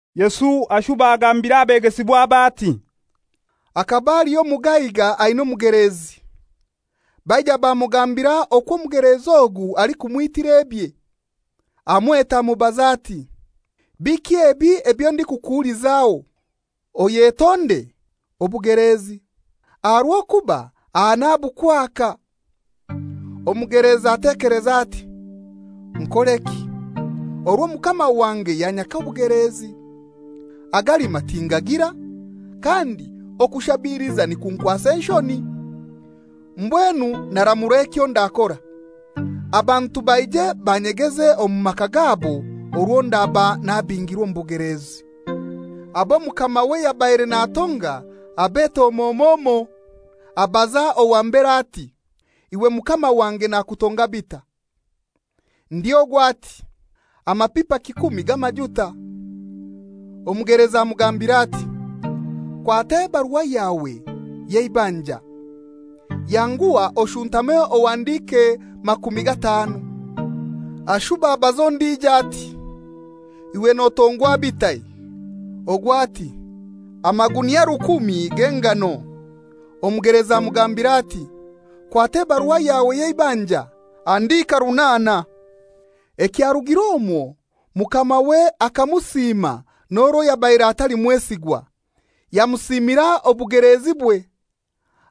Yesu ashuba agambira abegesibwabe ati, «Hakaba haliho omugaiga aina omugelezi. Baija bamugambira okwo omugeleezi ogu alikumwitaitira ebye. Amweta amubaza ati, ‹Biki ebi ebyo ndikukuhulizaho? Oyetonde obugeleezi, aha rw'okuba aha nabukwaka.› Omugeleezi atekeleza ati, ‹Nkoreki, orwo mukama wange yanyaka obugeleezi? Agalima tingagira, kandi okushabiiliza nikunkwasa enshoni. Mbwenu naramura ekyo ndakora, abantu baije banyegeze omu maka gabo orwo ndaba nabingirwe omu bugelezi.› Abo mukamawe yabaire natonga abeta omoi omoi omoi. Abaza owa mbere ati, ‹Iwe, mukama wange nakutonga bitai?› Ndi ogu ati, ‹Amapipa kikumi g'amajuta.› Omugeleezi amugambira ati, ‹Kwata ebarua yawe y'eibanja; yanguha oshuntame ohandike makumi gatanu.› Ashuba abaza ondijo ati, ‹Iwe notongwa bitai?› Ogu ati, ‹Amagunia kikumi g'engano.› Omugeleezi amugambira ati, ‹Kwata ebarua yawe y'eibanja; handika kinana.› Ekyarugir'omwo mukamawe akamusiima n'orwo yabaire atali mwesigwa, yamusiimira obugeleezibwe;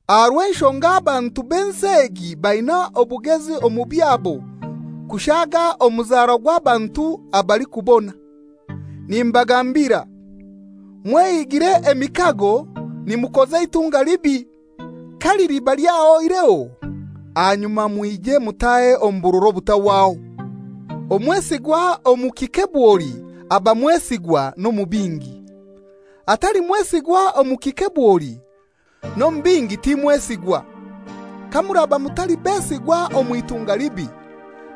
aha rw'enshonga abantu b'ensi egi baina obugezi omu byabo kushaaga omuzarwa gw'abantu abalikubona. Nimbagambira, mwehigire emikago nimukoza eitunga libi, kaliliba lyahoireho ahanyuma mwije mutahe omu burora obutahwaho. «Omwesigwa omu kike bwoli aba mwesigwa n'omu bingi. Atali mwesigwa omu kike bwoli, n'omu bingi ti mwesigwa. Kamuraba mutali besigwa omw'itunga libi,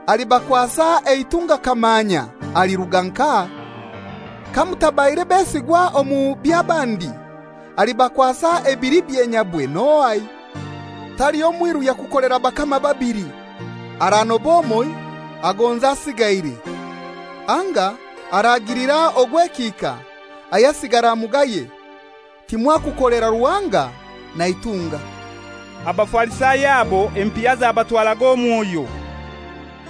alibakwasa eitunga kamaanya aliruga nkahai? Kamutabaire besigwa omu by'abandi, alibakwasa ebilibye nyabwe n'ohai? Taliho mwiru yakukolera bakama babili. Aranoba omoi, agonze asigaire; anga aragilira ogu ekihika, ayasigara amugaye. Timwakukolera Ruhanga na itunga.» Abafarisayo abo empiha zabatwaraga omwoyo.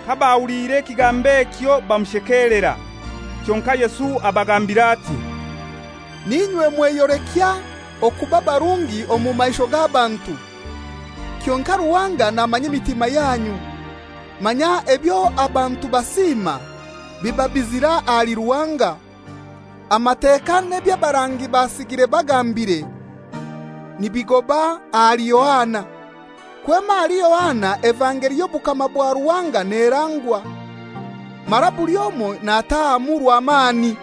Kabahuliire ekigambo ekyo bamushekelera. Kyonkai Yesu abagambira ati, «N'inywe mweyolekya okuba barungi omu maisho g'abantu, kyonkai Ruhanga namanya emitima yanyu. Manya ebyo abantu basiima, biba bizira ahali Ruhanga. «Amateka n'eby'abarangi basigire bagambire nibigoba ahali Yohana. Kwema ahali Yohana evangeli y'obukama bwa Ruhanga nerangwa, mara buli omoi natahamu rwamani.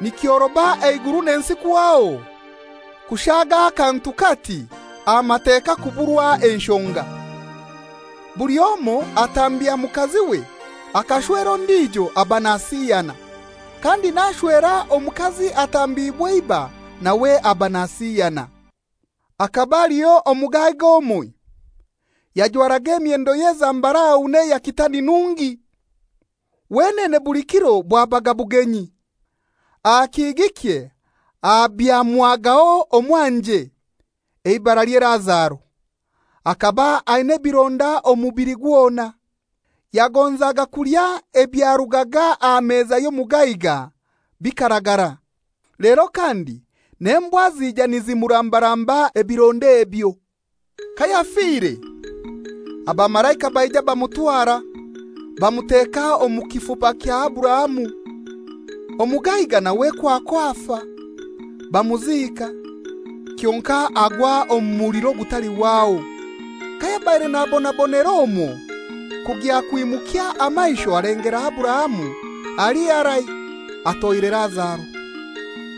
Nikyoroba eiguru n'ensi kuhwaho, kushaaga akantu kati aha Mateka kuburwa enshonga. «Buli omoi atambya mukaziwe akashwera ondijo aba nasiyana. Kandi n'ashwera omukazi atambiibwe iba nawe aba nasiyana. «Hakaba haliho omugaiga omoi, yajwaraga emyendo ya zambarau n'eya kitaani nungi. Wenene buli kiro bwabaga bugenyi. Aha kihigikye habyamwagaho omwanje, eibaralye Lazaro, akaba aina ebironda omubili gwona. Yagonzaga kulya ebyarugaga aha meza y'omugaiga bikaragara, lero kandi n'embwa zija nizimurambaramba ebironda ebyo. Kayafire, abamalaika baija bamutwara, bamuteka omu kifuba kya Aburahamu. Omugaiga nawe kwakwo afa, bamuziika, kyonkai agwa omu muliro ogutalihwaho. Kayabaire nabonabonera omwo, kugya kwimukya amaisho alengera Aburahamu ali harai, atoire Lazaro.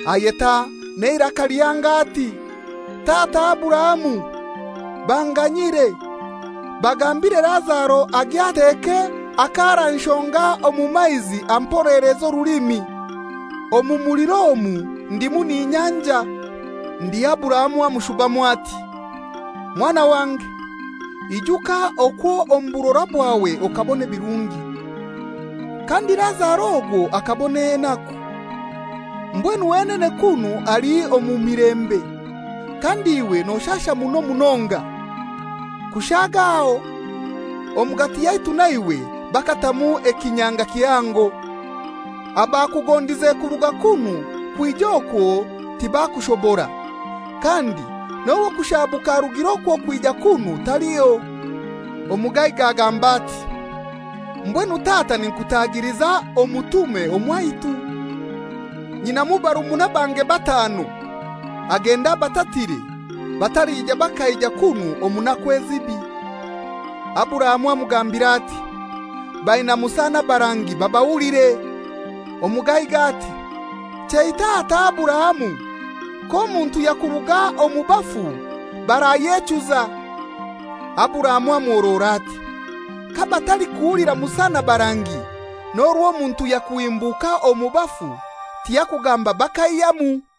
Ayeta n'eiraka lihango ati, ‹Tata Aburahamu, banganyire, bagambire Lazaro agye ateke akara nshonga omu maizi ampolereze orulimi. Omu muliro omu ndimu ninyanja.› Ndi Aburahamu amushubamu ati, ‹Mwana wange, ijuka okwo omu burora bwawe okabona ebirungi. Kandi Lazaro ogwo akabona enaku. Mbwenu wenene kunu ali omu milembe, kandi iwe noshasha muno munonga. Kushaaga aho, omugati yaitu na iwe bakatamu ekinyanga kihango. Abakugondize kuruga kunu kwija okwo tibakushobora, kandi n'ow'okushabuka arugire okwo kwija kunu taliho.› Omugaiga agamba ati, ‹Mbwenu tata ninkutagiliza omutume omwaitu, nyinamu barumuna bange batanu, agende abatatire, batalija bakaija kunu omu naku ezibi.› Aburahamu amugambira ati, ‹Baina Musa n'abarangi; babahuliire.› Omugaiga ati, ‹Chei, tata Aburahamu; k'omuntu yakuruga omu bafu barayechuza.› Aburahamu amuhorora ati, ‹Kabatalikuhulira Musa na barangi, n'orwo omuntu yakuhimbuka omu bafu tiyakugamba bakaihyamu.›»